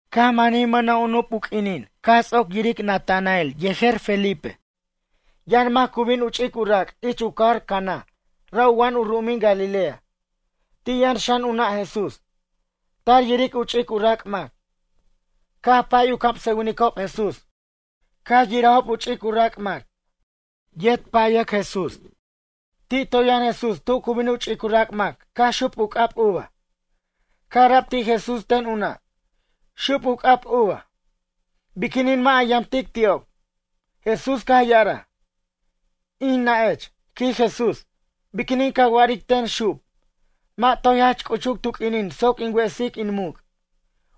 Caj manij mʌna' u nup u q'uinin caj ts'oc yiric Natanael yejer Felipe. Yʌn mac cu bin u ch'ic u rac' ich u cajar Caná ra' u wa'an u ru'umin Galilea. Ti' yʌn xan u nʌ' Jesús, tar yiric u ch'ic u rac' mac. Caj pay u camsʌwinicob Jesús caj yirajob u ch'ic u rac' mac. Yet payac Jesús. Ti' toy yʌn Jesús tu cu bin u ch'ic u rac' mac caj xup u c'ab uva. Caj ara'b ti' Jesús ten u nʌ': ―Xup u c'ab uva. Biquinin mʌ' a yamtic ti'ob? Jesús caj ya'araj: ―In nʌ'ech ―quij Jesús―, biquinin ca wa'aric ten xup? Mʌ' toy jach c'uchuc tu q'uinin soc in wesic in muc'.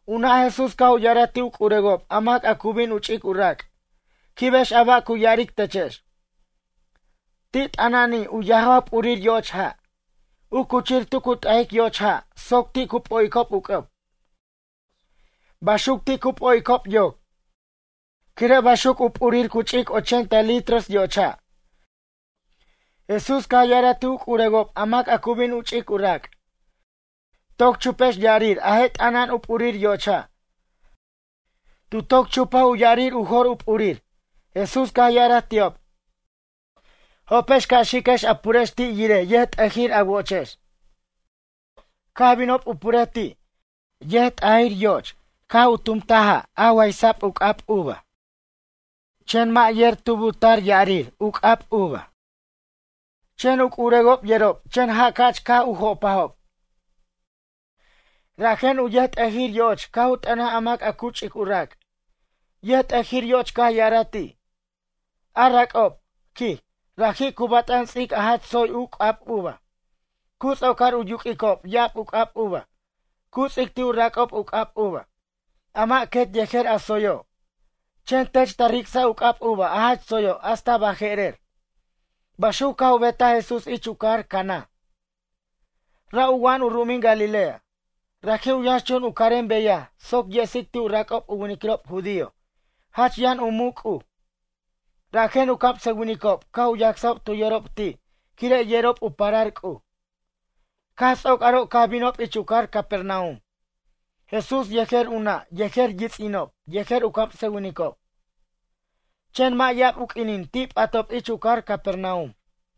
U nʌ' Jesús caj u ya'araj ti' u c'urewob a mac cu bin u ch'ic u rac': ―Quibex a ba' cu ya'aric techex. Ti' t'ana'ani' u yajaw p'urir yoch ja', u cuchir tu cu t'ajic yoch ja' soc ti' cu p'o'icob u c'ʌb. Baxuc ti' cu p'o'icob yoc. Quire' baxuc u p'urir cu ch'ic ochenta litros yoch ja'. Jesús caj ya'araj ti' u c'urewob a mac a cu bin u ch'ic u rac': ―Toc chupex ya'arir a je' t'ana'an u p'urir yoch ja'. Tu toc chupaj u ya'arir u jor u p'urir. Jesús caj u ya'araj ti'ob: ―Jopex ca' xiquex a purex ti' yirej yʌjt'ʌjir a wo'ochex. Caj binob u purej ti'. Yʌjt'ʌjir yoch caj u tumtaj ja' a waysa'b u c'ab uva. Chen mʌ' yer tub u tar ya'arir u c'ab uva. Chen u c'urewob yerob chen ja' ca'ch caj u jopajob. Rajen u yʌjt'ʌjir yo'och caj u t'ʌnaj a mac a cu ch'ic u rac'. Yʌjt'ʌjir yo'och caj ya'araj ti': ―A rac'ob ―quij―, raji' cu bat'an ts'ic a jach tsoy u c'ab uva. Cu ts'ocar u yuq'uicob ya'ab u c'ab uva, cu ts'ic ti' u rac'ob u c'ab uva, a mʌ' quet yejer a tsoyo'. Chen tech ta ric'saj u c'ab uva a jach tsoyo' hasta baje'rer. Baxuc caj u betaj Jesús ich u cajar Caná, ra' u wa'an u ru'umin Galilea. Raji' u yʌnxchun u carem beyaj soc yesic ti' u rac'ob u winiquirob judío jach yʌn u muc' C'uj. Rajen u camsʌwinicob caj u yacsob tu yorob ti' quire' yerob u parar C'uj. Caj ts'oc aro' caj binob ich u cajar Capernaum. Jesús yejer u nʌ' yejer yits'inob yejer u camsʌwinicob. Chen mʌ' ya'ab u q'uinin ti' p'atob ich u cajar Capernaum.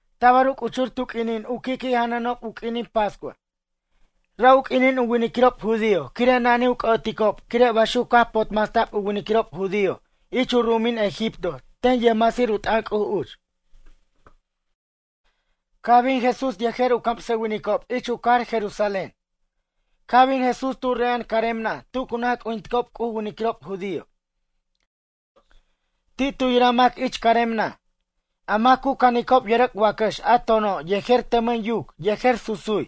Tabar u c'uchur tu q'uinin u qui'qui' janʌnob u q'uinin pascua. Ra' u q'uinin u winiquirob judío quire' na'nij u c'ʌ'oticob quire' baxuc caj potmasta'b u winiquirob judío ich u ru'umin Egipto ten yʌjmasir u t'ʌn C'uj uch. Caj bin Jesús yejer u camsʌwinicob ich u cajar Jerusalén. Caj bin Jesús tu re'a'an carem naj tu cu naj c'ujinticob C'uj u winiquirob judío. Ti' tu yiraj mac ich carem naj. A mac cu canicob yʌrʌc' wacʌx a tono' yejer tʌmʌn yuc yejer susuj.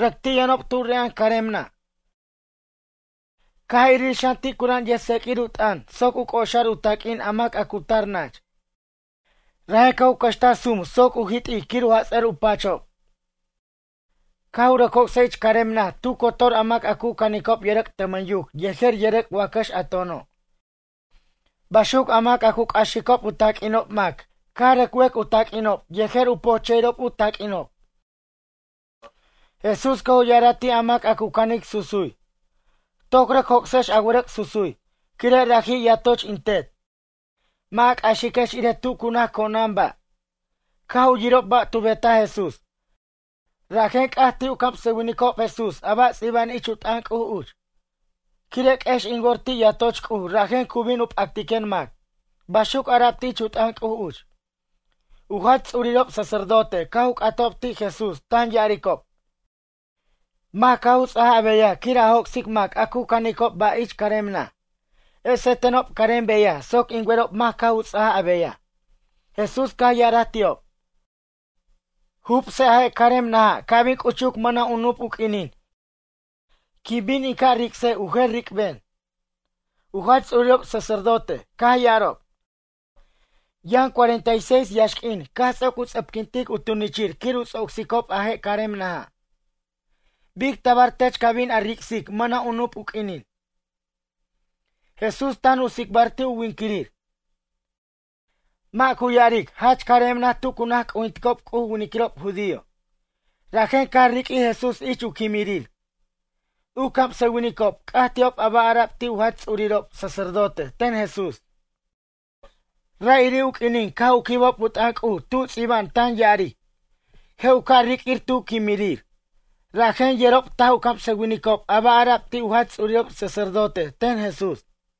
Rʌc ti' yʌnob tu re'a'an carem naj. Caj irir xan ti' cura'an yʌjc'axir u taq'uin soc u c'oxar u taq'uin a mac a cu tar nach. Rajen caj u cʌxtaj sum soc u jit'ic quir u jats'ʌr u pachob. Caj u rʌc joc'saj ich carem naj tu cotor a mac a cu canicob yʌrʌc' tʌmʌn yuc yejer yʌrʌc' wacʌx a tono'. Baxuc a mac cu c'axicob u taq'uinob mac caj u rʌc wec u taq'uinob yejer u pojche'irob u taq'uinob. Jesús caj u ya'araj ti' a mac a cu canic susuj: ―Toc rʌc joc'sex a wʌrʌc' susuj. Quire' raji' yatoch in Tet, mʌ' a c'axiquex irej tu cu naj co'nan ba'. Caj u yirob ba' tu betaj Jesús, rajen c'aj ti' u camsʌwinicob Jesús a ba' ts'iba'an ich u t'ʌn C'uj uch: “Quire' q'uex in wor ti' yatoch C'uj rajen cu bin u p'actiquen mac.” Baxuc ara'b ich u t'ʌn C'uj uch. U jach ts'urirob sacerdote caj u c'atob ti' Jesús tan ya'aricob: ―Mac caj u ts'aj a beyaj quir a joc'sic mac a cu canicob ba' ich carem naj? Ese tenob carem beyaj soc in werob mac caj u ts'aj a beyaj. Jesús caj ya'araj ti'ob: ―Jubse a je' carem naja' ca' bin c'uchuc mʌna' u nup u q'uinin, quin bin in ca' ric'sej u jer ric'ben. U jach ts'urirob sacerdote caj ya'arob: ―Yʌn cuarenta y seis yaxq'uin caj ts'oc u ts'ʌpquintic u tunichir quir u ts'ocsicob a je' carem naja'. Bic tabar tech ca' bin a ric'sic mʌna' u nup u q'uinin? Jesús tan u tsicbar ti' u winquirir, mʌ' cu ya'aric jach carem naj tu cu naj c'ujinticob C'uj u winiquirob judío. Rajen caj riq'uij Jesús ich u quimirir. U camsʌwinicob c'aj ti'ob a ba' ara'b ti' u jach ts'urirob sacerdote ten Jesús. Ra'iri' u q'uinin caj u quibob u t'ʌn C'uj tu ts'iba'an tan ya'aric: “Je' u ca' riq'uir tu quimirir.” Rajen yerob taj u camsʌwinicob a ba' ara'b ti' u jach ts'urirob sacerdote ten Jesús.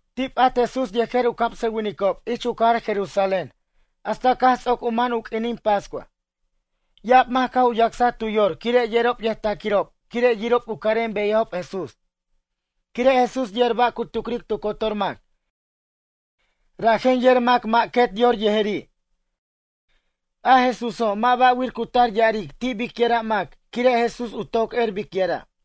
Ti' p'at Jesús yejer u camsʌwinicob ich u cajar Jerusalén hasta caj ts'oc u man u q'uinin pascua. Ya'ab mac caj u yacsaj tu yor quire' yerob yʌjtaquirob quire' yirob u carem beyajob Jesús. Quire' Jesús yer ba' cu tucric tu cotor mac rajen yer mac mʌ' quet yor yejeri'. A Jesúso' mʌ' ba'wir cu tar ya'aric ti' bicyʌra' mac quire' Jesús u toc er bicyʌra'.